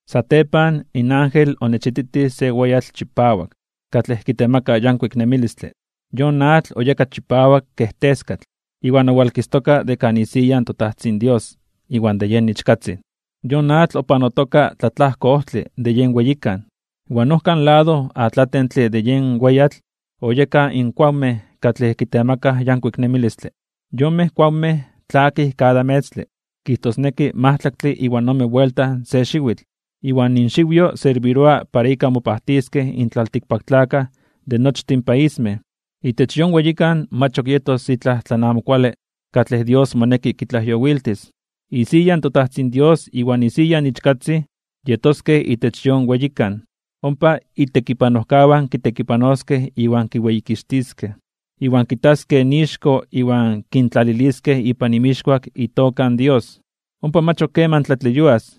Satepan in ángel onechititij se weyatl chipawak, katlej kitemaka yankuik nemilistle. Yon atl oyeka chipawak kej teskatl, iwan owalkistoka de kan isiya in toTajtzin Dios iwan de yen Ichkatzin. Yon atl opanotoka tlatlajko ojtle de yen weyikan. Iwan ojkan lado atlatentle de yen weyatl oyekaj in kuawmej katlej kitemakaj yankuik nemilistle. Yonmej kuawmej tlakij kada metztle, kijtosneki majtlaktle iwan ome buelta se xiwitl, iwan inxiwyo serbiroa para ika mopajtiskej in tlaltikpaktlakaj de nochtin paismej. Itech yon weyikan mach ok yetos itlaj tlan amo kuale katlej Dios moneki kitlajyowiltis. Isiya in toTajtzin Dios iwan isiya in Ichkatzin yetoskej itech yon weyikan. Ompa itekipanojkawan kitekipanoskej iwan kiweyikixtiskej. Iwan kitaskej ixko iwan kintlaliliskej ipan inmixkuak itoka in Dios. Ompa mach ok keman tlatleyuas.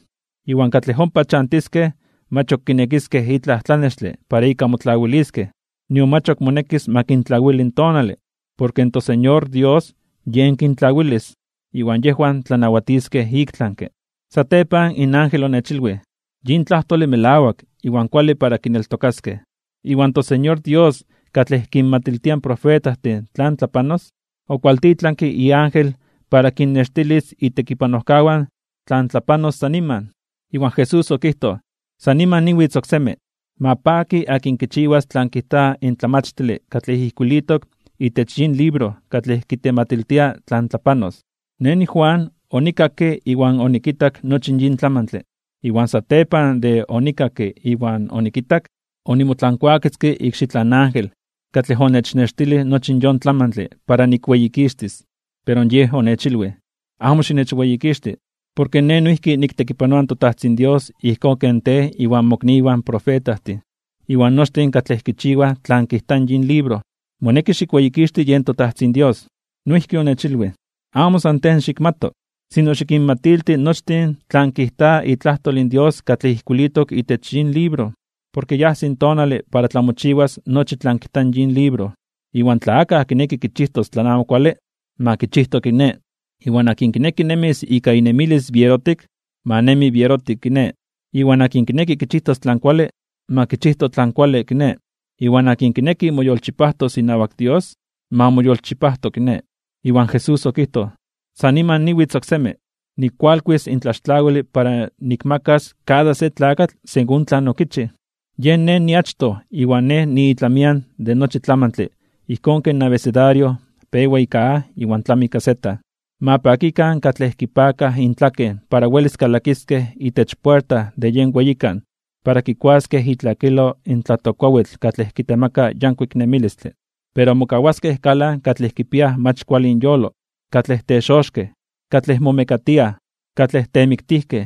Iwan katlej ompa chantiskej mach ok kinekiskej itlaj tlanextle para ika motlawiliskej, nion mach ok monekis ma kintlawili in tonale, porke in toSeñor Dios Yej kintlawilis. Iwan yejwan tlanawatiskej iktlanke (ik tlami). Satepan in ángel onechilwij: ―Yin tlajtole melawak iwan kuale para kineltokaskej. Iwan toSeñor Dios katlej kinmatiltia in profetajtin tlan tlapanos, okualtitlanke iángel para kinnextilis itekipanojkawan tlan tlapanos san niman. Iwan Jesús okijtoj: ―¡San niman niwitz oksemi! Ma paki akin kichiwas tlan kijta in tlamachtile katlej ijkuilitok itech yin libro katlej kitematiltia tlan tlapanos. Nej niJuan, onikakke iwan onikitak nochi yin tlamantle. Iwan satepan de onikakke iwan onikitak, onimotlankuaketzke ikxitlan ángel katlej onechnextilij nochi yon tlamantle para nikweyikixtis. Pero yej onechilwij: ―Amo xinechweyikixti. Porke nej noijki niktekipanoa in toTajtzin Dios ijkón ken tej iwan mokniwan profetajtin, iwan nochtin katlej kichiwaj tlan kijta in yin libro. Moneki xikweyikixti yen toTajtzin Dios. Noijki onechilwij: ―Amo san tej xikmato, sino xikinmatilti nochtin tlan kijta itlajtol in Dios katlej ijkuilitok itech yin libro. Porke ya ajsi tonale para tlamochiwas nochi tlan kijta in yin libro. Iwan tla akaj kineki kichijtos tlan amo kuale, ma kichijto kiné. Iwan akin kineki nemis ika inemilis bierotik, ma nemi bierotik kiné. Iwan akin kineki kichijtos tlan kuale, ma kichijto tlan kuale kiné. Iwan akin kineki moyolchipajtos inawak Dios, ma moyolchipajto kiné. Iwan Jesús okijtoj: ―¡San niman niwitz oksemi! Nikkualkuis in tlaxtlawile para nikmakas kada se tlakatl según tlan okichij. Yen Nej niachtoj iwan Nej niitlamian de nochi tlamantle ijkón ken abecedario pewa ika A iwan tlami ika Z. ’Ma pakikan katlej kipakaj intlaken para welis kalakiskej itech puerta de yen weyikan para kikuaskej itlakilo in tlatokkuawitl katlej kitemaka yankuik nemilistle. Pero mokawaskej kalan katlej kipiaj mach kuale inyolo, katlej texoxkej (brujojtij), katlej momekatiaj, katlej temiktijkej,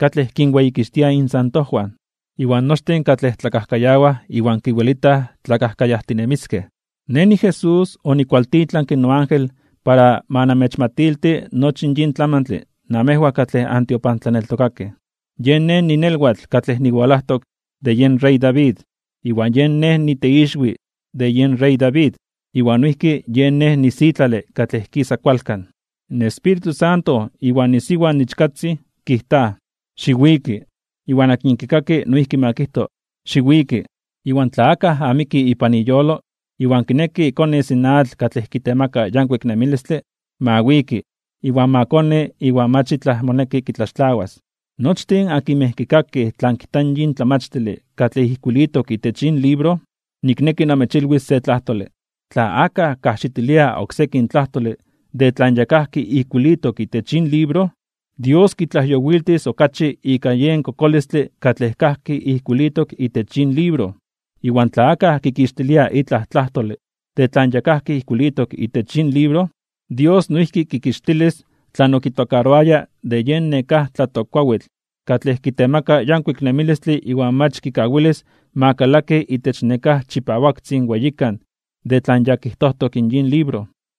katlej kinweyikixtiaj insantojwan, iwan nochtin katlej tlakajkayawaj iwan kiwelitaj tlakajkayajtinemiskej. ’Nej niJesús, onikkualtitlanke noángel para ma amechmatilti nochi in yin tlamantle namejwan katlej antiopantlaneltokakej. Yen Nej ninelwatl katlej niwalajtok de yen rey David, iwan yen Nej niteixwi de yen rey David. Iwan noijki yen Nej nisitlale katlej kisa kualkan. In Espíritu Santo iwan isiwa in Ichkatzin kijtaj: ―Xiwiki. Iwan akin kikaki, noijki ma kijto: ―Xiwiki. Iwan tla akaj amiki ipan iyolo, iwan kineki konis in atl katlej kitemaka yankuik nemilistle, ma wiki, iwan ma koni iwan mach itlaj moneki kitlaxtlawas. Nochtin akinmej kikakij tlan kijta in tlamachtile katlej ijkuilitok itech yin libro, nikneki namechilwis se tlajtole: Tla akaj kajxitilia oksekin tlajtole de tlan ya kajki ijkuilitok itech yin libro, Dios kitlajyowiltis okachi ika yen kokolistle katlej kajki ijkuilitok itech yin libro. Iwan tla akaj kikixtilia itlaj tlajtole de tlan ya kajki ijkuilitok itech yin libro, Dios noijki kikixtilis tlan okitokaroaya de yen nekáj tlatokkuawitl katlej kitemaka yankuik nemilistle iwan mach kikawilis ma kalaki itech nekáj chipawaktzin weyikan de tlan ya kijtojtok in yin libro.